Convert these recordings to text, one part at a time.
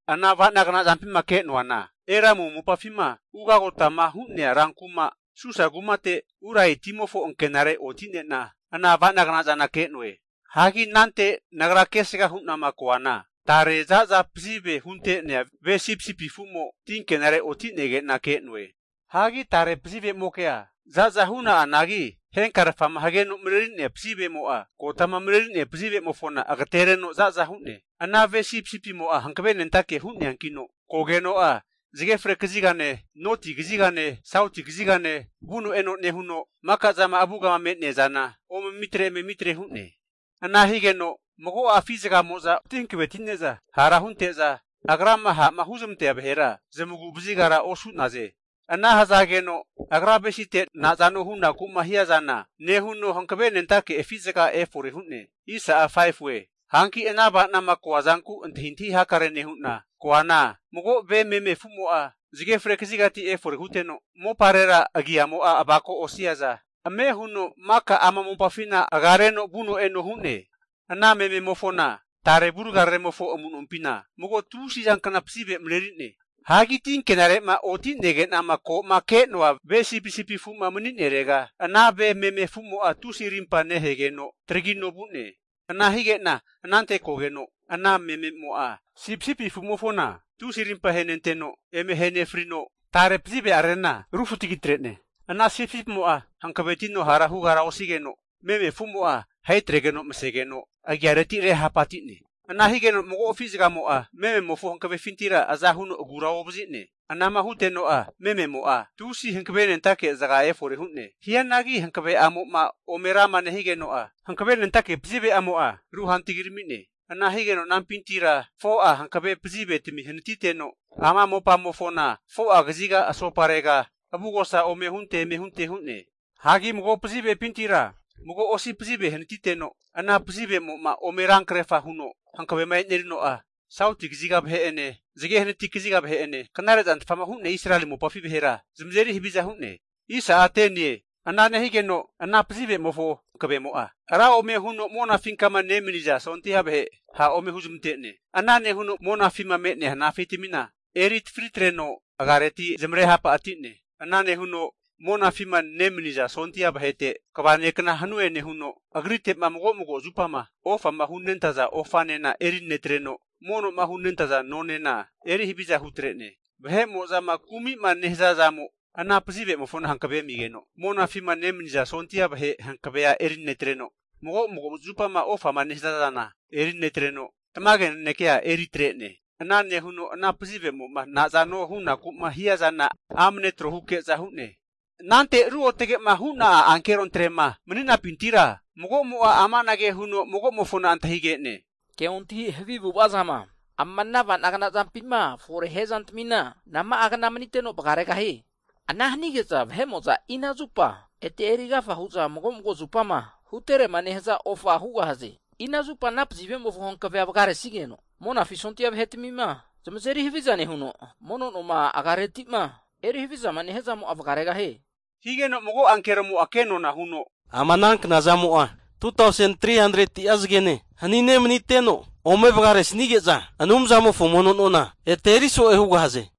Ana ava'nagna zampima ke'noana, Elamu mopafima ugagotama hu'nea ran kuma Susa kumate Ulai timofo ankenare oti'nena ana ava'nagna zana ke'noe. Hagi anante nagra kesgama hu'na koana, tare za'za pazive hunte'nea ve sipisipi afu'mo tinkenare oti'nege'na ke'noe. Hagi tare pazive'mokea za'za hu'na'anagi henkarfama hageno mareri'nea pazivemo'a, kotama marerinea pazivemofona agatereno za'za hu'ne. Ana ve sipisipimo'a hankavenentake hu'neakino kogeno'a, zage fre kazigane, noti kazigane, sauti kazigane vuno eno nehuno, maka zama avugama me'nea zana ome mitre eme mitre hu'ne. Ana higeno mago'a afi'zagamo'za oti hankavetine'za hara hunente'za, agrama ha'ma huzmantea vahera zamagu vazigara osu'naze. Ana hazageno agra avesite nazano hunaku'ma hiazana nehuno hankave nentake afi'zaga efore hu'ne. Hanki ana ava'nama koa zanku antahintahi hakare nehu'na koana, mago ve meme afu'mo'a zage fre kazigati efore huteno, moparera agiamo'a avako osiaza, ame huno maka ama mopafina agareno vuno e'no hu'ne. Ana mememofona tare avurgararemofo amunompina mago tusizankna pazive mareri'ne. Hagi tinkenare'ma oti'nege'nama ko'ma ke'noa ve sipisipi afu'ma mani'nerega, ana ve meme afu'mo'a tusi arimpa nehegeno taragino vu'ne. Ana hige'na anante kogeno ana mememo'a sipisipi afu'mofona tusi arimpa ahenenteno, eme ahe nefrino, tare pazive'ararena rufutagi atre'ne. Ana sipisipimo'a hankavetino hara hugara osigeno, meme afumo'a ahetregeno masegeno agiareti rehapati'ne. Ana higeno mago afi'zagamo'a, mememofo hankavefintira aza huno agura ovazi'ne. Anama huteno'a mememo'a tusi hankavenentake zaga efore hu'ne. Hianagi hankave'amo'ma ome rama nehigeno'a, hankavenentake pazive'amo'a ruhantagirami'ne. Ana higeno anampintira 4'a hankave pazivetami hanatiteno, ama mopamofona 4'a kaziga asoparega avugosa ome hunte eme hunte hu'ne. Hagi mago pazivepintira mago osi pazive hanatiteno, ana pazivemo'ma ome ran kerfama huno hankavema enerino'a, sauti kaziga vahe'ene zage hanati kaziga vahe'ene, knare zantfama hu'nea Israeli mopafi vahera zamazeri haviza hu'ne. Ana nehigeno ana pazivemofo hankavemo'a ra ome huno monafinkama nemaniza sondia vahe ha' ome huzmante'ne. Ana nehuno monafima me'nea hanafitamina eri atafri atreno agareti zamare hapati'ne. Ana nehuno monafima nemaniza sondia vahete Kva nekna hanue nehuno agrite'ma mago mago zupama ofama hunentaza ofanena erinetreno, mono'ma hunentaza nonena eri haviza hutre'ne. Vahemo'zama kumi'ma nehaza zamo ana pazive'mofona hankave amigeno, monafima nemaniza sondia vahe hankavea eri netreno, mago mago zupama ofama nehaza zana eri netreno, tamage nanekea eritre'ne. Ana nehuno ana pazivemo'ma nazano hunaku'ma hiazana amne tro huke'za hu'ne. Anante ruotage'ma hu'na'a ankerontre'ma mani'nampintira magomo'a amanage huno magomofona antahige'ne. Ke ontahi havi avu'ava zama ama ava'nagna zampima fore hia zantamina nama'a kna maniteno vagaregahie? Ana hanige'za vahe'mo'za ina zupa ete eri agafa hu'za mago mago zupama huterema nehaza ofa hugahaze? Ina zupa ana pazivemofo hankavea vagaresnigeno, Monafi sondia vahetamima zamazeri haviza nehuno, mono noma agiareti'ma eri havizama nehia zamo'a vagaregahie? Higeno mago ankeromo'a kenona huno, ama ana knazamo'a 2tausen 300'a zagene hanine maniteno ome vagaresnige'za, Anumzamofo mono nona ete eri so'e hugahaze.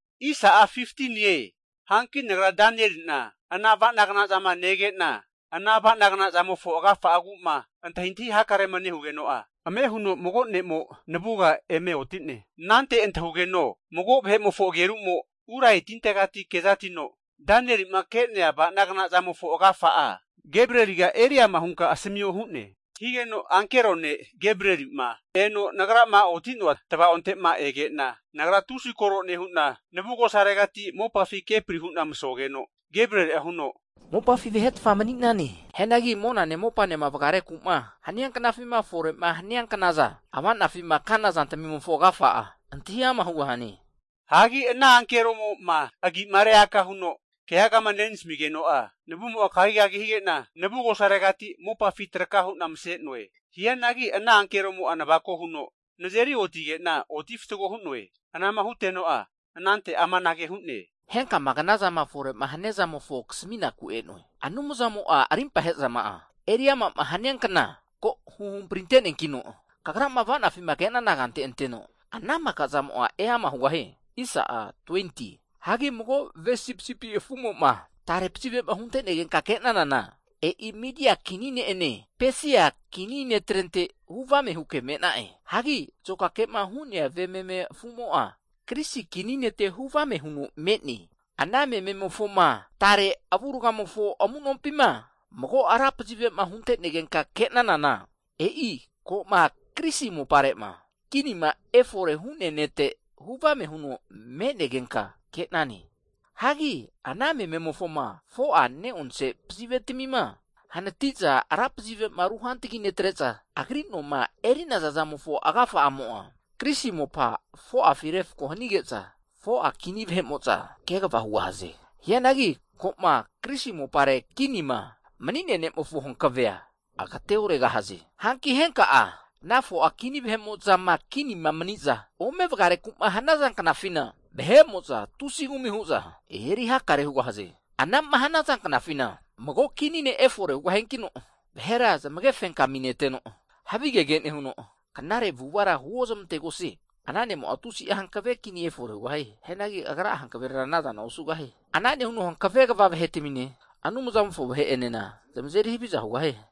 Hanki nagra Danieli'na ana avana gnazama nege'na, ana ava'nagna zamofo agafa'agu'ma antahintahi hakarema nehugeno'a, ame huno mago ne'mo navuga eme oti'ne. Anante antahugeno mago vahe'mofo ageru'mo Ulai tintegati kezatino, Danieli'ma ke'nea ava'nagna zamofo agafa'a Gebrieliga eri ama hunka asamio hu'ne. Higeno ankero ne' Gebrieli'ma eno nagrama oti'noa tvaonte'ma ege'na, nagra tusi koro nehu'na navugosaregati mopafi kepri hu'na masogeno, Gebrieli'a huno, mopafi vahetfa mani'nane. Hianagi monane mopanema vagareku'ma hania knafima fore'ma hania knaza ava'nafima kana zantamimofo agafa'a antahi ama' hugahane. Hagi ana ankeromo'ma agi'ma reaka huno keagama nenasamigeno'a, navumo'a kagigagi hige'na navugosaregati mopafi traka hu'na mase'noe. Hianagi ana ankeromo'a navako huno nazeri otige'na oti fatgo hu'noe. Anama huteno'a anante amanage hu'ne. Henkama knazama fore'ma hania zamofo kasaminaku e'noe. Anumzamo'a arimpa ahe'zama'ama eri ama'ma hania kna ko huhamprinte neankino, kagrama ava'nafima ke'nana kante anteno, ana maka zamo'a eama hugahie. Hagi mago ve sipisipi afu'mofoma tare pazive'ma hunte'negenka ke'nanana, e'i Midia kini ne'ene Pesia kini netrente huvame huke me'na'e. Hagi azokake'ma hu'nea ve meme afumo'a Grisi kini nete huvame huno me'ne. Ana mememofoma tare avurgamofo amu'nompima mago ra pazive'ma hunte'negenka'ma ke'nanana, e'i ko'ma Grisi mopare'ma kinima efore hu'nea nete huvame huno me'negenka ke'nane. Hagi ana mememofoma 4'a ne'onse pazivetamima hanati'za ra pazive'ma ruhantagi netre'za agri noma eri'naza zamofo agafa'amo'a, Grisi mopa 4'afi refko hanige'za, 4'a kini vahe'mo'za kegava hugahaze. Hianagi ko'ma Grisi mopare kinima mani'nea ne'mofo hankavea agateoregahaze. Hanki henka'a ana 4'a kini vahe'mo'zama kinima mani'za ome vagareku'ma hanaza knafina, vahe'mo'za tusi kumi hu'za eri hakare hugahaze. Anama hanaza knafina mago kini ne' efore hugahiankino, vahera zamage fenkami neteno, havigege nehuno, knare avu'avara huozmantegosie. Ana ne'mo'a tusi'a hankave kini efore hugahie. Hianagi agra'a hankaverera anazana osugahie. Ana nehuno hankave kva vahetamine Anumzamofo vahe'enena zamazeri haviza hugahie.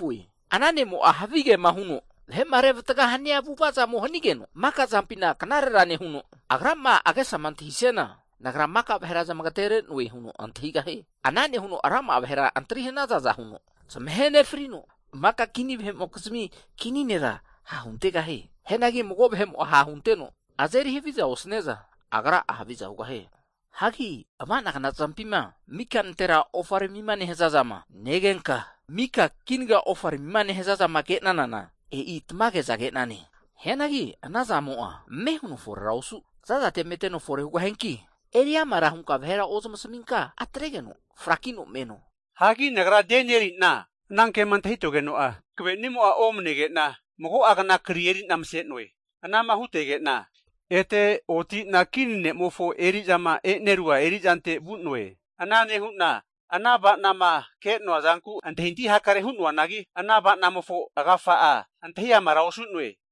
Ana ne'mo'a havigema huno vahe'ma revatgama hania avu'avazamo hanigeno, maka zampina knarera nehuno, agrama agesama antahisiana nagra maka vahera zamagatere'noe huno antahigahie. Ana nehuno rama'a vahera antri hanazaza huno zamahe nefrino, maka kini vahe'mokizmi Kini nera ha' huntegahie. Hianagi mago vahe'mo ha'hunteno azeri haviza osaniaza agra'a haviza hugahie. Hagi ava'nagna zampima mika nantera ofaramima nehaza zama negenka, mika kinaga ofaramima nehaza zama ke'nanana, e'i tamage'za ke'nane. Hianagi ana zamo'a ame' huno forera osu zazate meteno fore hugahianki, eri amara hunka vahera ozamasaminka atregeno frakino meno. Hagi nagra Danieli'na anankema antahitogeno'a hankavenimo'a omanege'na, mago'a kna kri eri'na mase'noe. Anama hutege'na ete oti'na kini ne'mofo eri'zama e'nerua eri'zante vu'noe. Ana nehu'na ana ava'nama ke'noa zanku antahintahi hakare hu'noanagi, ana ava'namofo agafa'a antahi amara osu'noe.